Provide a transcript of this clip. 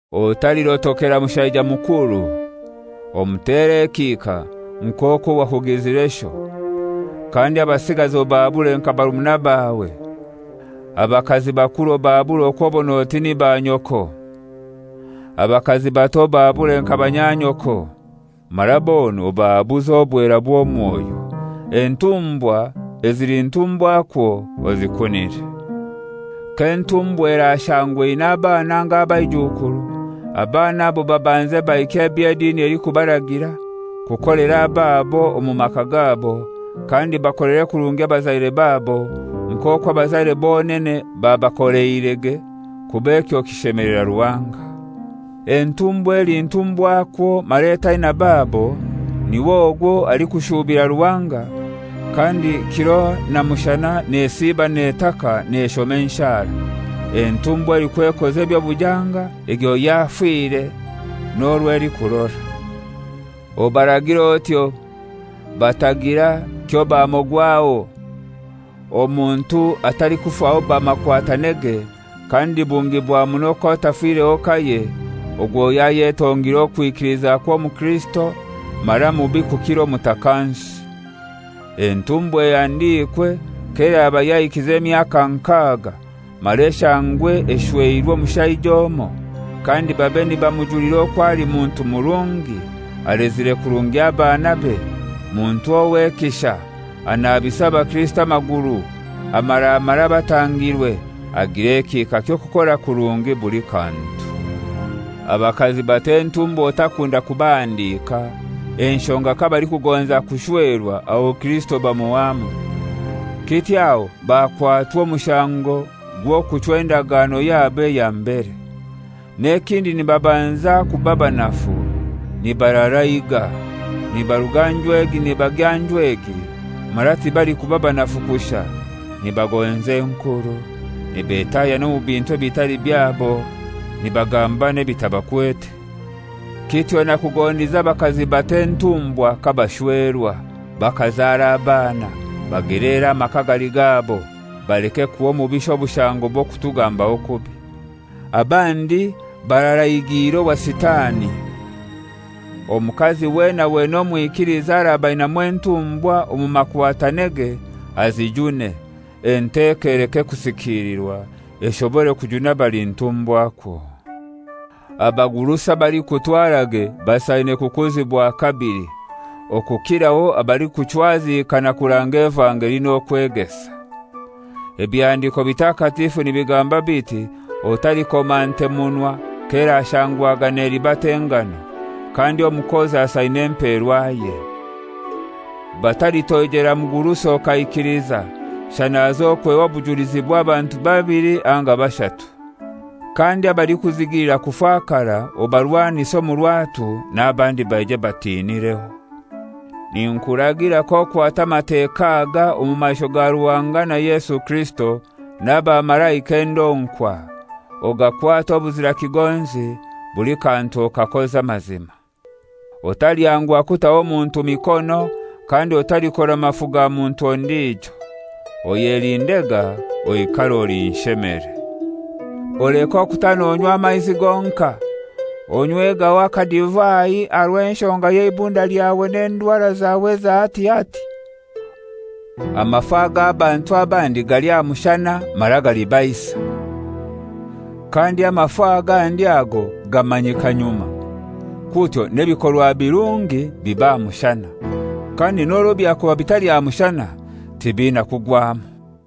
Otalirotokera mushaija mukuru; omutere ekihika nk'okwo wakugizire sho. Kandi abasigazi obahabure nka barumuna bawe. Abakazi bakuru obahabure okw'obon'oti ni banyoko. Abakazi bato obahabure nka banyanyoko, mara bona obahabuze obwera bw'omwoyo. Entumbwa ezili ntumbwakwo ozikunire. K'entumbwa erashangwa eina abana anga abaijukuru, abana abo babanze bahikye eby'edini elikubaragira kukolera ababo omu maka gabo, kandi bakolere kurungi abazaire babo nk'okwo abazaire bonene babakoleirege kuba ekyo kishemelera Ruhanga. Entumbwakazi eli ntumbwakwo mara etaina babo, niw'ogwo alikushuubira Ruhanga, kandi kiro na mushana nesiiba netaka, neshoma enshara. Entumbwa elikwekoza eby'obujanga egyo yafire n'orwo elikurora. Obaragire otyo, batagira kyobamogwaho. Omuntu atalikufaho bamakwatanege, kandi bungi bwa muno k'atafireho kaye, ogwo yayetongire okwikiliza kw'omukirisito mara mubi kukira omutakansi. Entumbwa ehandikwe k'eraba yahikize emyaka nkaga, mara eshangwe eshweirwe omushaija omoi, kandi babe nibamujulira okwo ali muntu murungi, alezire kurungi abanabe, muntu ow'ekisha, anabisa abakristo amaguru, amaramara abatangirwe, agira ekihika ky'okukora kurungi buli kantu. Abakazi bato entumbwa otakunda kubahandika, enshonga kabalikugonza kushwerwa aho Kirisito bamuhwamu. Kityo aho bakwatwa omushango gw'okuchwa endagano yabo eya mbere. N'ekindi nibabanza kuba banafu, nibararaiga, nibaruga nju egi nibagya nju egi, mara tibalikuba banafu kushai: Nibagonza enkuru, nibetahya n'omu bintu ebitali byabo, nibagamba n'ebitabakwete. Kityo nakugondize abakazi bato entumbwa kabashwerwa, bakazara abana, bageleere amaka agali gabo, baleke kuha omubisha obushango bw'okutugambaho kubi. Abandi bararaigiire owa Sitani. Omukazi wena wena omwikiliza araba ainamu entumbwa omu makwatanege, azijune. Enteko eleke kusikilirwa, eshobore kujuna abali ntumbwakwo. Abagurusi abalikutwarage basaine kukuzibwa kabili, okukiraho abalikuchwazikana kuranga evangeli n'okwegesa. Ebihandiko Bitakatifu nibigamba biti, «Otalikoma nte munwa k'erashangwaga nelibata engano,» kandi, «Omukozi asaine emperwaye.» Batalitoijera mugurusi okaikiliza, shana hazokweho obujulizi bw'abantu babili anga bashatu. Kandi abalikuzigilira kufakara obarwanise omu rwatu, n'abandi baije batinireho. Ninkuragira k'okwata Amateka aga omu maisho ga Ruhanga na Yesu Kirisito n'abamalaika endonkwa, ogakwate obuzira kigonzi, buli kantu okakoze amazima. Otalyanguha kutaho muntu mikono, kandi otalikora mafu ga muntu ondijo. Oyelindega, oikare oli nshemere. Oleke okuta nonywa amaizi gonkai. Onywegaho akadivai aha rw'enshonga y'eibunda lyawe n'endwara zawe eza hati hati. Amafu ag'abantu abandi gali aha mushana, mara galibaisa. Kandi amafu agandi ago gamanyika nyuma. Kutyo n'ebikorwa birungi biba aha mushana; kandi n'orwo byakuba bitali aha mushana, tibiina kugwamu.